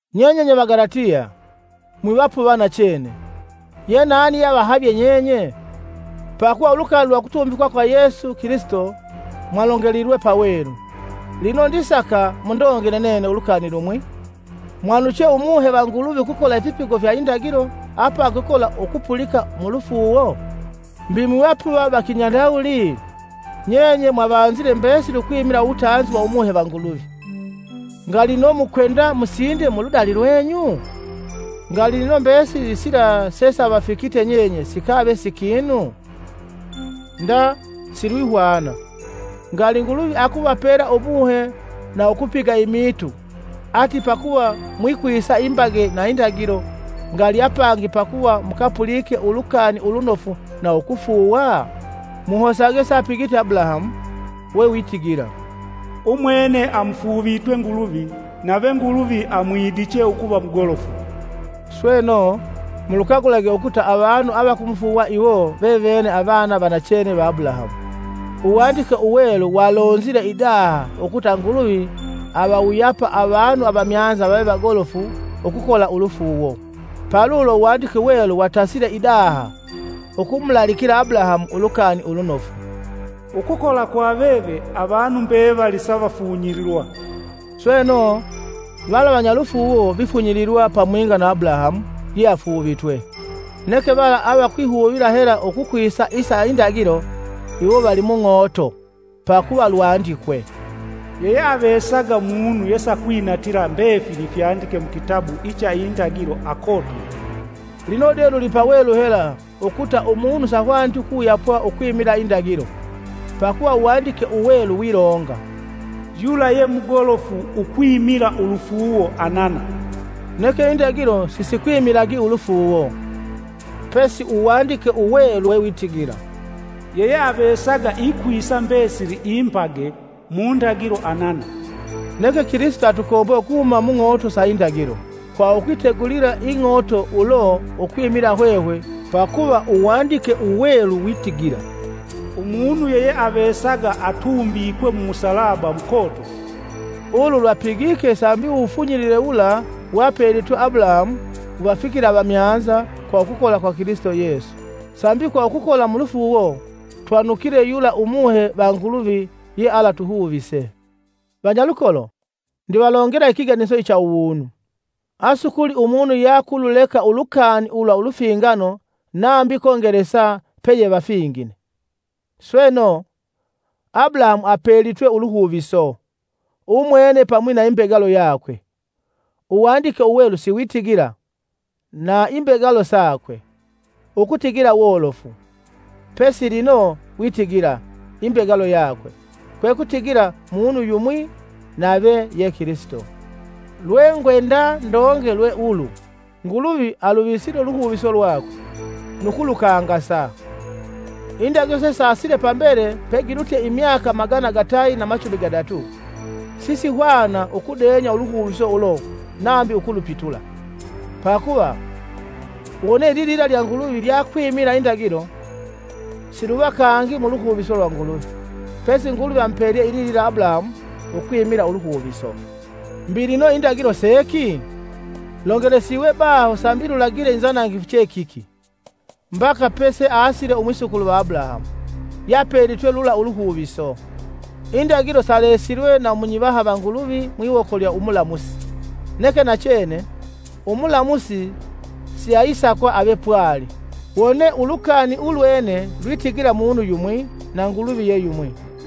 Nyenye nye Vagalatiya, mwivapuva nachene! Ye nani yeavahavye nyenye? Pakuva ulukani lwa ukutumbikwa kwa Yesu Kilisito, mwalongelilwe pawelu. Lino ndisaka mundongele nene lukani lumwi. Mwanuche Umuhe va Nguluvi ukukola ifipigo fya indagilo apangi ukukola ukupulika mulufuuwo? Mbi mwivapuva va Kinyandawuli? Nyenye mwavanzile mbesili ukwimila uwutanzi wa Umuhe va Nguluvi, ngali lino mukwenda musinde muludali lwenyu? Ngali lino mbesili sila sesavafikite nyenye sikave si kinu? Nda silwihwana! Ngali Nguluvi akuvapela Umuhe na ukupiga imiitu ati pakuva mwikwisa imbage na indagilo, ngali apangi pakuva mukapulike Ulukani Ulunofu na ukufuuwa? Muhosage seapigite Abulahamu: wewitigila, umwene amufuuvitwe Nguluvi, nave Nguluvi amwidiche ukuva mugolofu. Sweno, mulukagulage ukuta avanu avakumufuuwa iwo vevene avana va nachene va Abulahamu. Uwandike Uwelu walonzile idaha ukuta Nguluvi avawuyapa avanu avamyanza vave vagolofu ukukola ulufuuwo. Palulo Uwandike Uwelu watasile idaha ukumulaalikila Abulahamu Ulukani Ulunofu, “Ukukola kwa veve avanu mbevali savafunyililwa.” Sweno, vala vanyalufuuwo vifunyililwa pamwinga na Abulahamu yeafuuvitwe. Neke vala avakwihuvila hela ukukwisa isa indagilo, iwo vali mung'oto. Pakuva lwandikwe, “Yeyeavesaga munu yesakwinatila mbefili ifyandike mukitabu icha Indagilo akotwike.” Lino de lulipawelu hela ukuta umunu sahwaniti ukuwuyapwa ukwimila indagilo, pakuva Uwandike Uwelu wilonga, “Yula ye mugolofu ukwimila ulufuuwo anana.” Neke indagilo sisikwimilagi ulufuuwo. Pesi Uwandike Uwelu wewitigila, “Yeyeavesaga ikwisa mbesili imbage mu ndagilo anana.” Neke Kilisito atukombwe ukuhuma mung'ooto lwa indagilo kwa ukwitegulila ing'ooto ulo ukwimila hwehwe pakuva Uwandike Uwelu witigila, “Umunu yeyeavesaga atumbikwe mumusalaba mukotofu.” Ulu lwapigike sambi uwufunyilile wula wapelitwe Abulahamu wuvafikile avamyanza kwa ukukola kwa Kilisito Yesu, sambi kwa ukukola mulufuuwo, twanukile yula Umuhe va Nguluvi ye alatuhuvise. Vanyalukolo, ndivalongela ikiganiso icha uwunu. Asukuli umunu yeakululeka ulukani ulwa ulufingano nambi kongelesa peyevafingine. Sweno, Abulahamu apelitwe uluhuviso, umwene pamwi na imbegalo yakwe. Uwandike Uwelu siwitigila, “Na imbegalo sakwe.” Ukutigila wolofu, pesi lino witigila, “Imbegalo yakwe.” Kwekutigila munu yumwi nave ye Kilisito. Lwengwenda ndonge lwe ulu Nguluvi aluvisile uluhuviso lwakwe, nu kulukangasa; Indagilo sesasile pambele pegilutye imyaka magana gatayi na machumi gadatu, sisihwana ukudenya uluhuviso ulo nambi ukulupitula. Pakuva, wone ililila lya Nguluvi lyakwimila indagilo, siluva kangi muluhuviso lwa Nguluvi. Pesi Nguluvi amupelye ililila Abulahamu ukwimila uluhuviso. Mbi lino indagilo seki? Longelesiwe baho sambi lulagile inzanangifu che kiki, mbaka peseasile umwisukulu va Abulahamu, yeapelitwe lula uluhuviso. Indagilo salesilwe na munyivaha va Nguluvi mwiwoko lya umulamusi. Neke nachene, umulamusi siayisakwa ave pwali, wone ulukani ulwene lwitigila munu yumwi; na Nguluvi ye yumwi.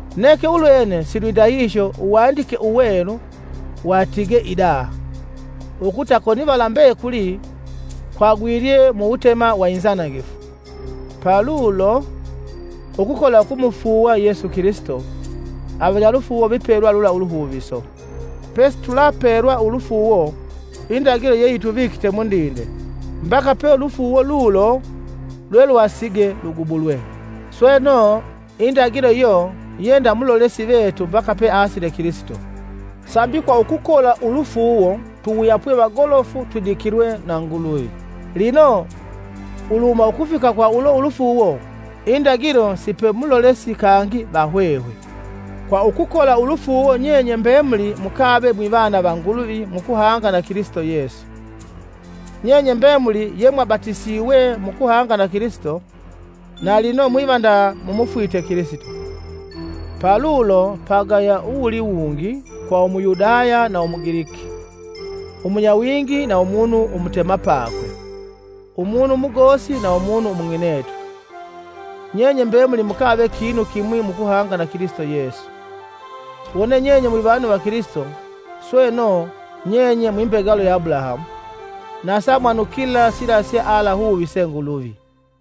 Neke ulwene silwindahihyo Uwandike Uwelu watigee idaha, ukuta konivala mbekuli kwagwilye mu wutema wa inzanangifu, palulo, ukukola ukumufuuwa Yesu Kilisito avanyalufuuwo vipelwa lula uluhuviso. Pesitulapelwa ulufuuwo, indagilo yeyituvikite mundinde mbaka pe ulufuuwo lulo lwelwasige lugubulwe. Sweno, indagilo iyo ye nda mulolesi vetu mbaka peasile Kilisito, sambi kwa ukukola ulufuuwo tuwuyapwe vagolofu twidikilwe na Nguluvi. Lino uluhuma ukufika kwa ulo ulufuuwo, indagilo sipe mulolesi kangi va hwehwe. Kwa ukukola ulufuuwo nyenye mbemuli mukave mwivana va Nguluvi mukuhanga na Kilisito Yesu. Nyenye mbemuli yemwabatisiwe mukuhanga na Kilisito, na lino mwiva nda mumufwite Kilisito. Palulo, pagaya uwululiwungi kwa Umuyudaya na Umugiliki, Umunyawingi na umunu umutemapakwe, umunu umugosi na umunu umung'inetu. Nyenye mbemuli mukave kinu kimwi mukuhanga na Kilisito Yesu. Wone nyenye mwivanu va Kilisito, sweno nyenye mwi mbegalo ya Abulahamu, na samwanukila sila sealahuvise Nguluvi.